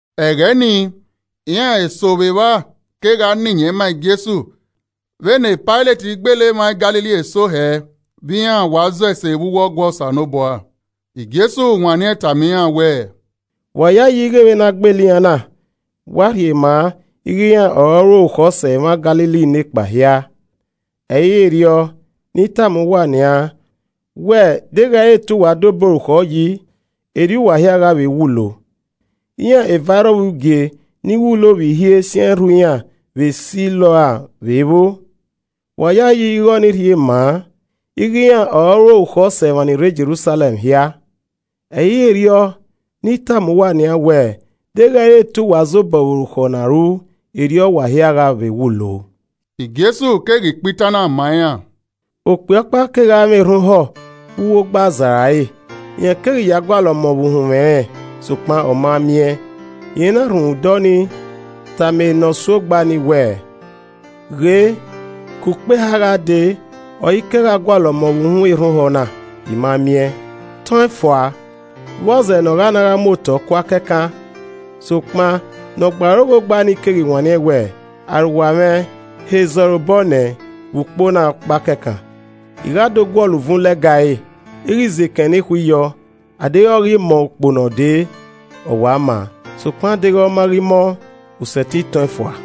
Ẹghẹ nii, iran eso vbe evba kegha na iyẹn ma Jesu vbene Pailet gbele emwa Galili eso hẹ vbe iran wa zọ ese ghe Osanobua. Jesu wanniẹn tama iran wẹẹ, “Wa yayi ighẹ vbene a gbele iran na wa rhie maa ighẹ iran ọre ọ ru orukhọ sẹ emwa Galili nekpa hia? Ẹ i re erriọ! Ne I tama uwa nian wẹ deghẹ i re te uwa dobọ orukhọ yi, erriọ wa hia gha vbe wulo. Iran evairrọvbugie ni wulo vbe ihie siẹn rhu iran vbe Siloam vbe vbo? Wa yayi ighẹ ọnii rhie maa ighẹ iran ọre ọ ru orukhọ sẹ emwa ni rre Jerusalẹm hia? Ẹ i re erriọ, ne I tama uwa nian wẹ deghẹ i re te uwa zobọ vbe orukhọ na ru, erriọ wa hia gha vbe wulo.” Jesu keghi kpa itan na ma iran: “Okpia ọkpa kegha mwẹ erhan ohọ vbe uwu ogba azara ẹre. Rẹn keghi ya gha gualọ ọmọ vbe uhunmwu ẹnrẹn, sokpan ọ ma miẹn. Rẹn na rhunmwuda ọnii tama ne ọ gbearoghe ogba nii wẹẹ, ‘Ghe ke ukpo eha gha dee ọre I kegha gualọ ọmọ vbe uhunmwu erhan ohọ na, I ma miẹn. Tọn ẹn fua, vbọzẹ ne ọ gha na gha mu otọ kua kẹkan.’ Sokpan ne ọ gbe aro ghe ogba nii keghi wanniẹn wẹẹ, ‘Arowa mwẹ, he zẹ ọre obọ nẹ vbe ukpo na ọkpa kẹkan, I gha do guọlọ uvun lẹga ẹre, I ghi zẹ ekẹn nekhui yọ. A deghẹ ọ ghi mọ ukpo ne ọ dee, ọ wa maa, sokpan deghẹ ọ ma ghi mọ, u sẹtin tọn ẹn fua.’”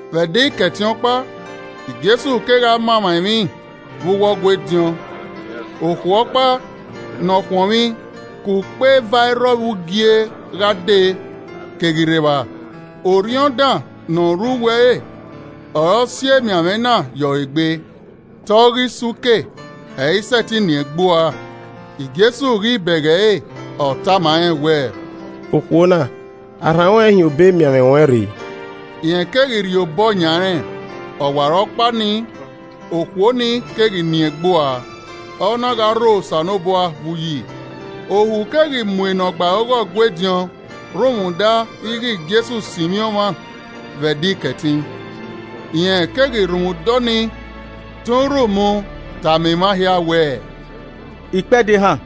Vbe Ẹdẹ Ikẹtin ọkpa, Jesu kegha ma emwa emwi vbe uwu Ọgua ediọn. Okhuo ọkpa ne ọ khuọnmwi ke ukpo evairrọvbugie gha dee keghi rre evba, orhiọn dan ne ọ rre uwu ẹre ọre ọ si emianmwẹ na ye ọre egbe. Te ọ ghi so uke, ẹ i sẹtin nien egbe ua. Jesu ghi bẹghe ẹre, ọ tama rẹn wẹẹ, “Okhuo na, a rhan ruẹn hin obọ emianmwẹ ruẹn re.” Rẹn keghi rhie obọ yan rẹn, ọwarọkpa nii okhuo nii keghi nien egbe ua, ọ na gha rho Osanobua vbe uyi. Ohu keghi mu enọ gbe aro ghe Ọgua ediọn rhunmwuda ighe Jesu sinmwi ọmwa vbe Ẹdẹ Ikẹtin, rẹn keghi rhunmwuda ọnii tọn urhu mu tama emwa hia wẹẹ, “Ikpẹdẹ ehan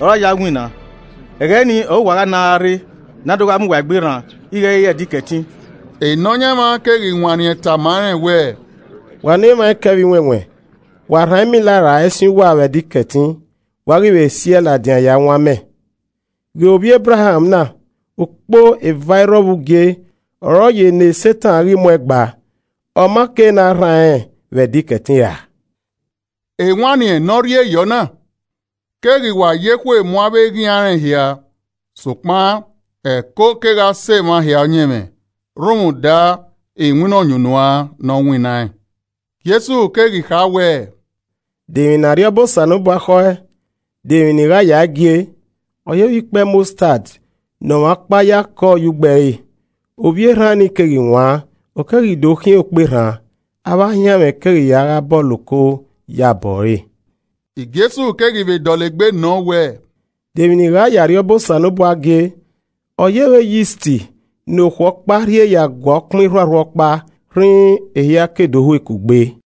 ọre a ya winna, ẹghẹ ni ọre uwa gha na gha rre ne a do gha mu uwa egbe rran ighẹ ẹ i re Ẹdẹ Ikẹtin.” Nọyaẹnmwa keghi wanniẹn tama rẹn wẹẹ, “Wa ne emwa ẹkẹ vbe iwẹnwẹn, wa rhan ẹmila ra ẹsin uwa vbe Ẹdẹ Ikẹtin, wa ghi vbe siẹe ladian ya wọn amẹ. Ghe ovbi Ebraham na, ukpo evairrọvbugie ọre ọ ye ne Setan ghi mu ẹẹn gba, ọ ma ke ne a rhan rẹn vbe Ẹdẹ Ikẹtin ra?” Ewanniẹn ne ọ rhie yọ na keghi wa ya ekhue mu avbe eghian rẹn hia, sokpan ẹko kegha sẹ emwa hia ọyẹnmwẹ rhunmwuda iwinna ọyunnuan ne ọ winnaẹn. Jesu keghi kha wẹẹ, “De emwi ne Arriọba Osanobua khọe? De emwi ne I gha yae gie? Ọ yevbe ikpẹ mọstad ne ọmwa ọkpa ya kọ ye ugbo ẹre, ovbi erhan nii keghi wan, ọ keghi do khian okperhan, avbe ahianmwẹ keghi ya gha bọlọ oko ye abọ ẹre.” Jesu keghi vbe dọlegbe nọ wẹẹ, “De emwi ne I gha ye Arriọba Osanobua gie? Ọ yevbe yist ne okhuo ọkpa rhie ya gua ọkpan irhuarhua ọkpa, rhirhi ehia ke do hue kugbe.”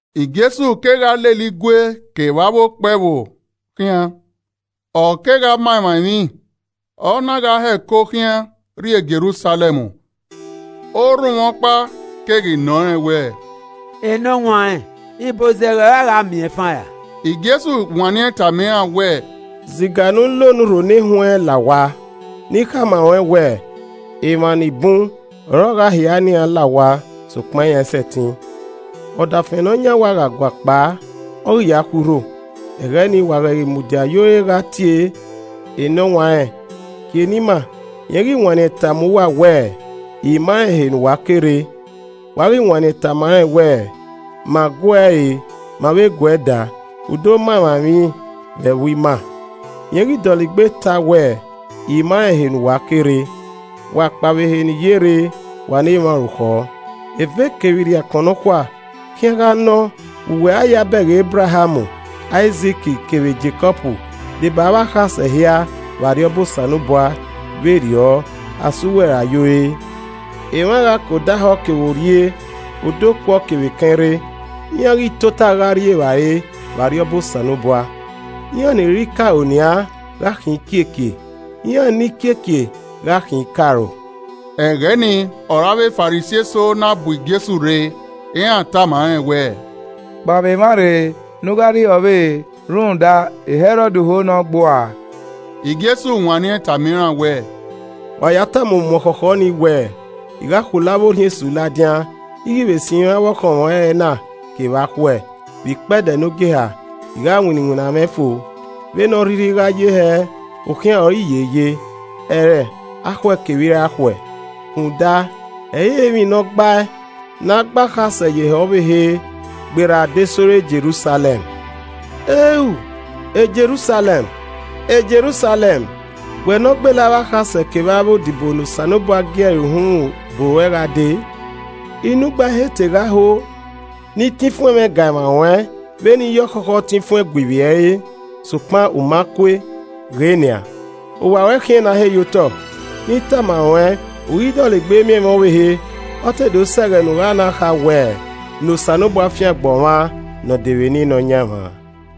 Jesu kegha lele igue kevbe avbe okpe ẹvbo khian, ọ kegha ma emwa emwi, ọ na gha hẹko khian rrie Jerusalẹm. Orhunmwu ọkpa keghi nọ rẹn wẹẹ, “Enọwanrẹn, ibozẹghẹ ọre a gha miẹnfan ra?” “Jesu wanniẹn tama iran wẹẹ, ziga ne u la onurho ne wẹnrẹn la owa, ne I khama ruẹn wẹẹ, emwa ni bun ọre ọ gha hia ne iran la owa sokpan iran i sẹtin. Ọdafẹn ne ọ yan owa gha guakpao, ọ ghi ya khui urho, ẹghẹ nii, wa ghẹ ghi mudia ye ore gha tie, ‘Enọwanrẹn, kie ne ima!’ rẹn ghi wanniẹn tama uwa wẹẹ, ‘I ma rẹn ehe ne uwa ke rre.’ Wa ghi wanniẹn tama rẹn wẹẹ, ‘Ma gu uẹ re, ma vbe gu uẹ daa, u do ma emwa emwi vbe ẹvbo ima.’ Rẹn ghi dọlegbe tae wẹẹ, ‘I ma rẹn ehe ne uwa ke rre, wa kpao vbe ehe ne I ye rre, wa ne emwa orukhọ!’ Eve kevbe irriakọn nọkhua khian gha nọ vbe uwẹ a ya bẹghe Ebraham, Aizik, kevbe Jekọb deba avbe akhasẹ hia vbe Arriọba Osanobua, vberriọ, a sẹ uwẹ rae ye ore. Emwa gha ke odẹ ahọ kevbe orrie, odẹ okuọ kevbe ekẹn rre, iran ghi tota gha rri evbare vbe Arriọba Osanobua. Iran ni re ikaro nian gha khian ikiekie, iran ni kiekie gha khian ikaro.” Ẹghẹ nii ọre avbe Farisi eso na bu Jesu rre, iran tama rẹn wẹẹ, “Kpao vbe emwa rre ne u gha rrie ehe ọvbehe rhunmwuda Hẹrọd ho ne ọ gbe uẹ ua.” Jesu wanniẹn tama iran wẹẹ, “Wa ya tama umuọkhọkhọ nii wẹẹ, ‘I gha khulo avbe Orhiọn esu ladian, I ghi vbe sinmwi avbe ọkhọnmwẹ ẹrẹna kevbe akhuẹ, vbe ikpẹdẹ ne ogieha, I gha winna iwinna mwẹ fo.’ Vbene ọ rhirhi a gha ye hẹ, okhian ọre I ye ye, ẹrẹ akhuẹ kevbe irakhuẹ, rhunmwuda, ẹ i re emwi ne ọ gbae ne a gbe akhasẹ ye ehe ọvbehe gberra adesẹ ore Jerusalẹm. “Eu! Jerusalẹm, Jerusalẹm! Wẹ ne ọ gbele avbe akhasẹ kevbe avbe odibo ne Osanobua gie ẹre uhunmwu bu ruẹ gha dee! Inu igba I he te gha ho ne I tan ifuẹn mwẹ ga emwa ruẹn vbe ne iye ọkhọkhọ tan ifuẹn gue ivbi ẹre, sokpan u ma kue. Ghe nian, owa ruẹ khian ne a he ye otọ. Ne I tama ruẹn u ighi dọlegbe miẹn mwẹ ọvbehe, ọ te do sẹ ẹghẹ ne u gha na kha wẹ, ‘Ne Osanobua fiangbe ọmwa ne ọ dee vbe eni Nọyaẹnmwa.’”